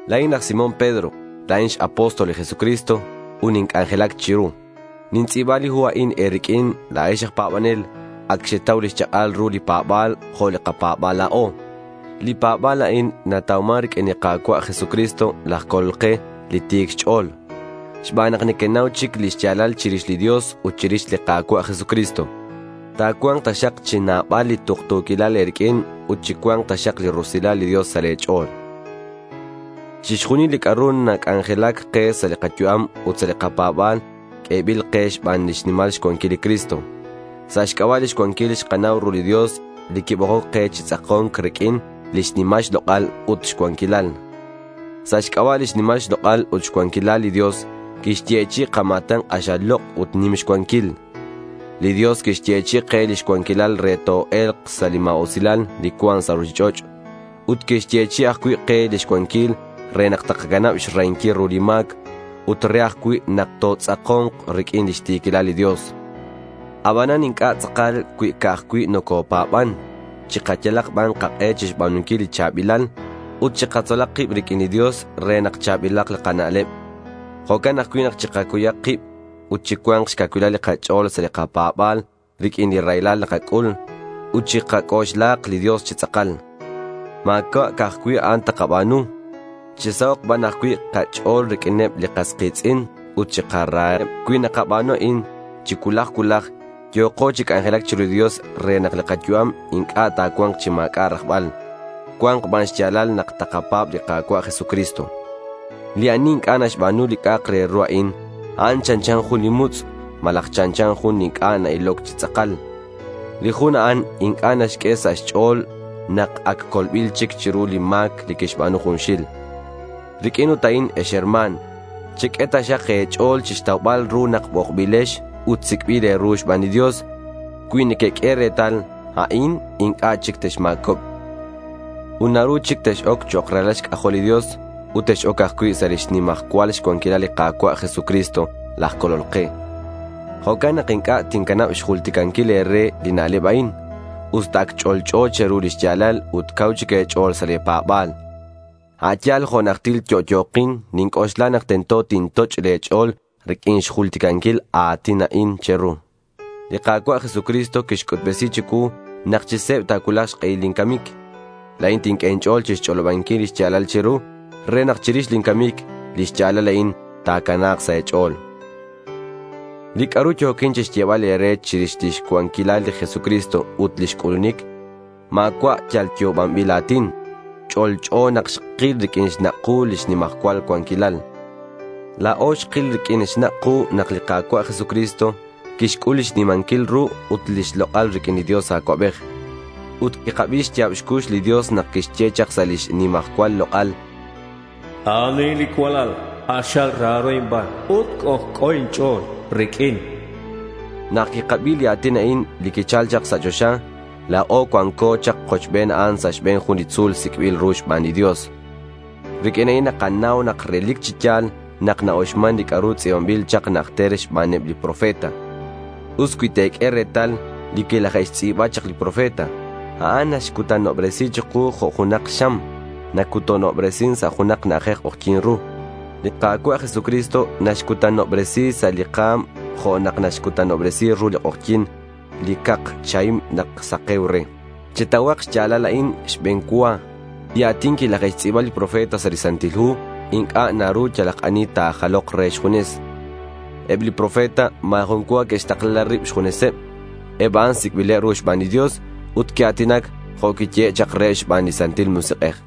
La̱in laj Simón Pedro. La̱in x-apóstol li Jesucristo ut ninc'anjelac chiru. Nintz'i̱ba li hu a'in e̱riq'uin, la̱ex aj pa̱banel. Ac xetau lix chak'al ru li pa̱ba̱l jo' li kapa̱ba̱l la̱o. Li pa̱ba̱l a'in natauman riq'uin li Ka̱cua' Jesucristo laj Colol ke, li ti̱c xch'o̱l. Xban nak nequenau chic li xya̱lal chirix li Dios ut chirix li Ka̱cua' Jesucristo, ta̱cua̱nk taxak chi nabal li tuktu̱quilal e̱riq'uin ut chi cua̱nk taxak li rusilal li Dios sa' le̱ ch'o̱l. Chixjunil li c'a'ru nac'anjelac ke sa' li kayu'am ut sa' li kapa̱ba̱l q'uebil ke xban xnimal xcuanquil li Cristo. Sa' xc'aba' lix cuanquil xkanau ru li Dios li quibokoc ke chi tz'ako̱nc riq'uin lix nimal xlok'al ut xcuanquilal. Sa' xc'aba' lix nimal xlok'al ut xcuanquilal li Dios quixyechi'i kama̱tan k'axal lok' ut nim xcuanquil. Li Dios quixyechi'i ke lix cuanquilal re toe̱lk sa' li ma̱usilal li cuan sa' ruchich'och' ut quixyechi'i ajcui' ke lix cuanquilal re nak takacanab xrahinquil ru li ma̱c, ut re ajcui' nak totz'ako̱nk riq'uin lix ti̱quilal li Dios. Abanan inc'a' tz'akal cui ca'aj cui' nocopa̱ban. Chikayalak ban kak'e chixba̱nunquil li cha̱bilal. Ut chikatzolak kib riq'uin li Dios re nak cha̱bilak li kana'leb. Jo'can ajcui' nak chikacuyak kib. Ut chicua̱nk xcacuil li kach'o̱l sa' li kapa̱ba̱l riq'uin li raylal nakac'ul ut chikac'oxlahak li Dios chi tz'akal. Ma̱cua' ca'aj cui' a'an takaba̱nu. Chisahok' ban ajcui' kach'o̱l riq'uineb li kas ki̱tz'in ut chikaraheb. Cui nakaba̱nu a'in chi cuulaj cuulaj, yo̱ko chi c'anjelac chiru li Dios re nak li kayu'am inc'a' ta̱cua̱nk chi ma̱c'a' rajbal. Cua̱nk ban xya̱lal nak takapa̱b li Ka̱cua' Jesucristo. Li ani inc'a' naxba̱nu li c'a'ak re ru a'in, a'an chanchan jun li mutz' malaj chanchan jun li inc'a' na-iloc chi tz'akal. Li jun a'an inc'a' naxq'ue sa' xch'o̱l nak ac colbil chic chiru li ma̱c li quixba̱nu junxil. Riq'uin ut a'in ex herma̱n, cheq'ue taxak e̱ch'o̱l chixtaubal ru nak bokbilex ut sic'bil e̱ru xban li Dios. Cui nequeq'ue retal a'in inc'a' chic texma̱cobk. Ut naru chic tex-oc chok' ralal xc'ajol li Dios. Ut tex-oc ajcui' sa' lix nimajcual xcuanquilal li Ka̱cua' Jesucristo laj Colol ke. Jo'can nak inc'a' tincanab xjulticanquil e̱re li na'leb a'in, usta ac ch'olch'o che̱ru lix ya̱lal ut cau chic e̱ch'o̱l sa' le̱ pa̱ba̱l. A' yal jo' najtil yo'yo̱kin, ninc'oxla nak tento tintoch' le̱ ch'o̱l riq'uin xjulticanquil a a̱tin a'in che̱ru. Li Ka̱cua' Jesucristo quixc'utbesi chicuu nak chi se̱b ta̱cuulak xk'ehil lin camic. La̱in tinq'ue inch'o̱l chixch'olobanquil lix ya̱lal che̱ru re nak chirix lin camic lix ya̱lal a'in ta̱cana̱k sa' e̱ch'o̱l. Li c'a'ru yo̱quin chixyebal e̱re chirix lix cuanquilal li Jesucristo ut lix c'ulunic, ma̱cua' yal yo'obanbil a̱tin. Ch'olch'o nak xkil riq'uin xnak' ku lix nimajcual cuanquilal. La̱o xkil riq'uin xnak' ku nak li Ka̱cua' Jesucristo quixc'ul lix nimanquil ru ut lix lok'al riq'uin li Dios Acuabej. Ut quikabi xya̱b xcux li Dios nak quixye chak sa' lix nimajcual lok'al, a'an a'in li cualal k'axal raro inban. Ut c'ojc'o inch'o̱l riq'uin, chan. Nak quikabi li a̱tin a'in li quichal chak sa' choxa, la̱o cuanco chak kochben a'an sa' xbe̱n jun li tzu̱l sic'bil ru xban li Dios. Riq'uin a'in nakanau nak relic chi ya̱l na-uxman li c'a'ru tz'i̱banbil chak najter xbaneb li profeta. Us cui te̱q'ue retal li quilaje'xtz'i̱ba chak li profeta. A'an naxcutanobresi chiku jo' junak xam nacutanobresin sa' junak na'ajej k'ojyi̱n ru. Li Ka̱cua' Jesucristo naxcutanobresi sa' li ka̱m jo' nak naxcutanobresi ru li k'ojyi̱n li cak chahim nak sake̱uc re. Chetauhak xya̱lal a'in xbe̱n cua: li a̱tin quilaje'xtz'i̱ba li profeta sa' li Santil Hu inc'a' naru yalak ani ta̱jalok re xjunes. Eb li profeta ma̱ jun cua que'xtakla rib xjuneseb. Eb a'an sic'bileb ru xban li Dios ut que'a̱tinac jo' quiyehe' chak reheb xban li Santil Musik'ej.